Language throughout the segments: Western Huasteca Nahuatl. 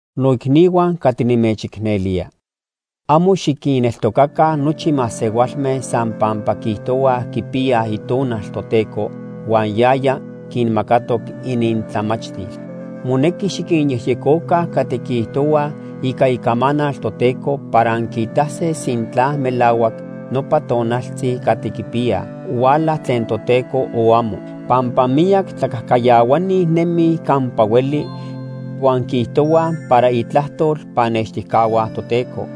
Noicnihua catli nimechicnelía. Amo xiquinneltocaca nochi masehualme san pampa quiijtohuaj quipiyaj Itonal Toteco huan yaya quinmacatoc inintlamachtil. Monequi xiquinyejyecoca catli quiijtohuaj ica Icamanal Toteco para anquiitase sintla melahuac nopa tonaltzi catli quipiyaj huala tlen Toteco, o amo. Pampa miyac tlacajcayahuani nemij campa hueli, huan quiijtohuaj para itlajtol pannextijcahua Toteco,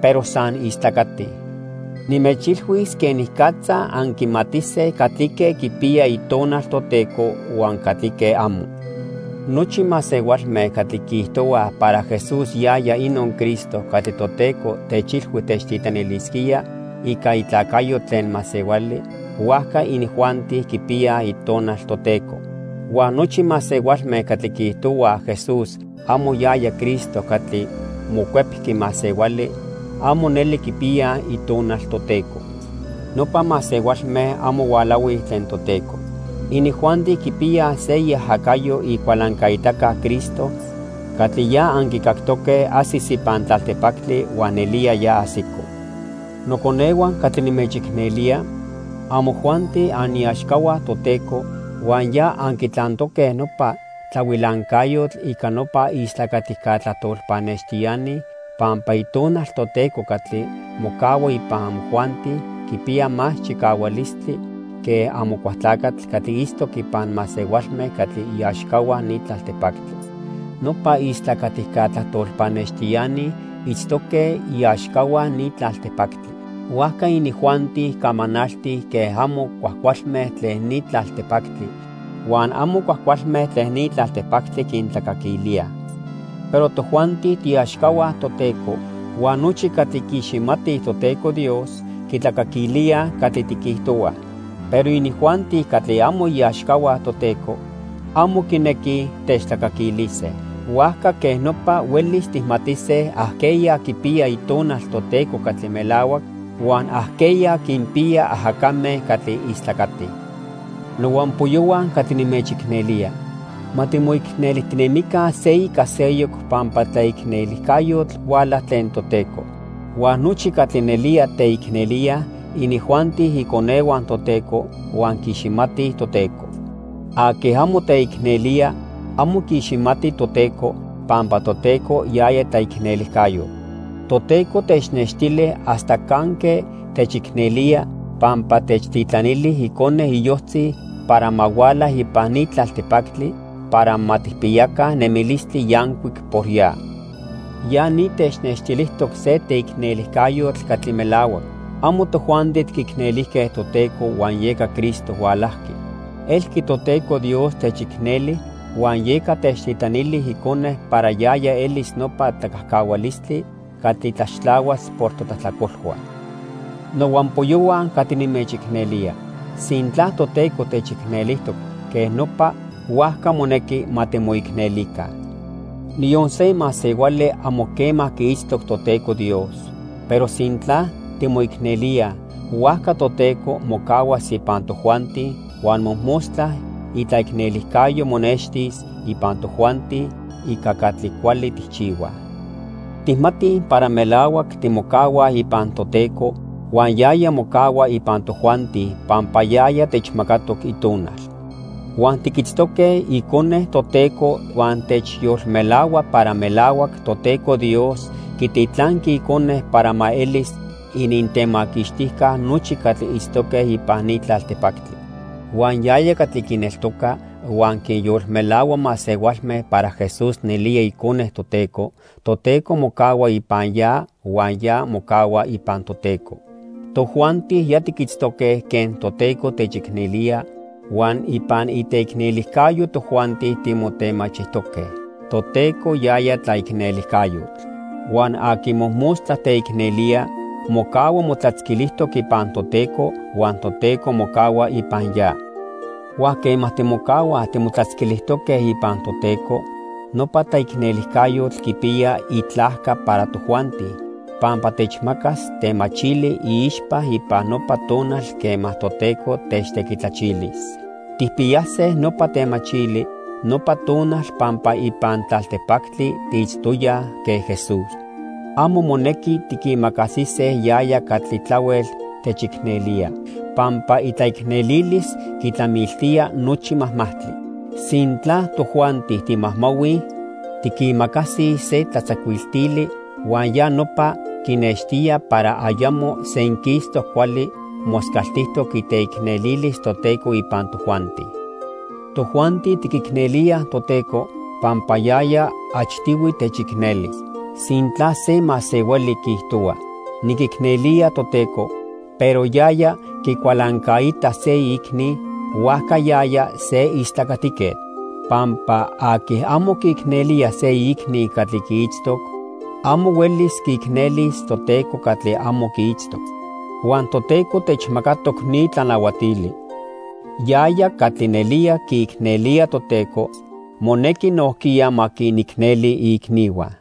pero san istlacatij. Nimechilhuis quenicatza anquimatise catlique quipiya Itonal Toteco huan catlique amo. Nochi masehualme catli quiijtohuaj para Jesús yaya inon Cristo catli Toteco techilhui techtitlanilisquía ica itlacayo tlen masehuali, huajca inijuanti quipiyaj Itonal Toteco. Huan nochi masehualme catli quiijtohuaj Jesús amo yaya Cristo catli mocuepqui masehuali, amo neli quipiyaj Itonal Toteco. Nopa masehualme amo hualahuij tlen Toteco. Inijuanti quipiyaj se iajacayo Icualancaitaca Cristo catli ya anquicactoque ajsis ipan tlaltipactli huan nelía ya ajsico. Noconehua catli nimechicnelía, amojuanti aniaxcahua Toteco huan ya anquitlantoque nopa tlahuilancayotl ica nopa istlacatica tlajtol pannextiani pampa Itonal Toteco catli mocahua ipan amojuanti quipiya más chicahualistli que Amocualtlacatl catli itztoc ipan masehualme catli iaxcahua ni tlaltipactli. Nopa istlacatica tlajtol pannextiani itztoque iaxcahua ni tlaltipactli. Huajca inijuanti camanaltij quen amo cuajcualme tlen ni tlaltipactli, huan amo cuajcualme tlen ni tlaltipactli quintlacaquilíaj. Pero tojuanti tiiaxcahua Toteco, huan nochi catli quiiximatij Toteco Dios quitlacaquilíaj catli tiquijtohuaj. Pero inijuanti catli amo iaxcahua Toteco, amo quinequij techtlacaquilise. Huajca quej nopa huelis tijmatise ajqueya quipiya Itonal Toteco catli melahuac, huan ajqueya quinpiya ajacame catli istlacatij. Nohuampoyohua catli nimechicnelía, ma timoicnelijtinemica se ica seyoc pampa tlaicnelijcayotl huala tlen Toteco. Huan nochi catli nelía teicnelíaj, inijuanti iconehua Toteco huan quiiximatij Toteco. Aqui amo teicnelía amo quiiximati Toteco, pampa Toteco, yaya tlaicnelijcayotl. Toteco technextili hasta canque techicnelía pampa techtitlanili Icone iyojtzi para ma huala ipan ni tlaltipactli para ma tijpiyaca nemilistli yancuic por ya. Ya ni technextilijtoc se teicnelijcayotl catli melahuac. Amo tojuanti tiquicnelijque Toteco huan yeca Cristo hualajqui. Elqui Toteco Dios techicneli huan yeca techtitlanili Icone para yaya elis nopa tlacajcahualistli catli tlaxtlahuas por totlajtlacolhua. Nohuampoyohua catli nimechicnelía, sintla Toteco techicnelijtoc quej nopa, huajca monequi ma timoicnelica. Niyon se masehuali amo quema quiitztoc Toteco Dios, pero sintla timoicnelíaj, huajca Toteco mocahuas ipan tojuanti huan mojmostla itlaicnelijcayo monextis ipan tojuanti ica catli cuali tijchihuaj. Tijmatij para melahuac timocahuaj ipan Toteco huan yaya mocahua ipan tojuanti pampa yaya techmacatoc Itonal. Huan tiquitztoque Icone Toteco huan timechyolmelahuaj para melahuac Toteco Dios quititlanqui Icone para ma elis inintemaquixtijca nochi catli itztoque ipan ni tlaltipactli. Huan yaya catli quineltoca huan quinyolmelahua masehualme para Jesús nelía Icone Toteco, Toteco mocahua ipan ya huan ya mocahua ipan Toteco. Tojuanti ya tiquitztoque quen Toteco techicnelía huan ipan iteicnelijcayo tojuanti timotemachijtoque. Toteco yaya tlaicnelijcayotl. Huan aqui mojmostla teicnelía mocahua motlatzquilijtoc ipan Toteco huan Toteco mocahua ipan ya. Huan quema timocahuaj timotlatzquilijtoque ipan Toteco, nopa tlaicnelijcayotl quipiya itlajca para tojuanti pampa techmacas temachili iixpa ipan nopa tonal quema Toteco techtequitlachilis. Tijpiyase nopa temachili nopa tonal pampa ipan tlaltipactli tiitztoyaj quen Jesús. Amo monequi tiquimacasise yaya catli tlahuel techicnelía, pampa itlaicnelilis quitlamiltía nochi majmajtli. Sintla tojuanti timajmahuij, tiquimacasij se tlatzacuiltili huan ya nopa quinextía para ayamo senquistoc cuali moscaltijtoc iteicnelilis Toteco ipan tojuanti. Tojuanti tiquicnelíaj Toteco, pampa yaya achtihui techicneli. Sintla se masehuali quiijtohua: "Niquicnelía Toteco", pero yaya quicualancaita se iicni, huajca yaya se istlacatiquetl. Pampa aqui amo quiicnelía se iicni catli quiitztoc, amo huelis quiicnelis Toteco catli amo quiitztoc. Huan Toteco techmacatoc ni tlanahuatili: Yaya catli nelía quiicnelía Toteco, monequi nojquiya ma quinicneli iicnihua.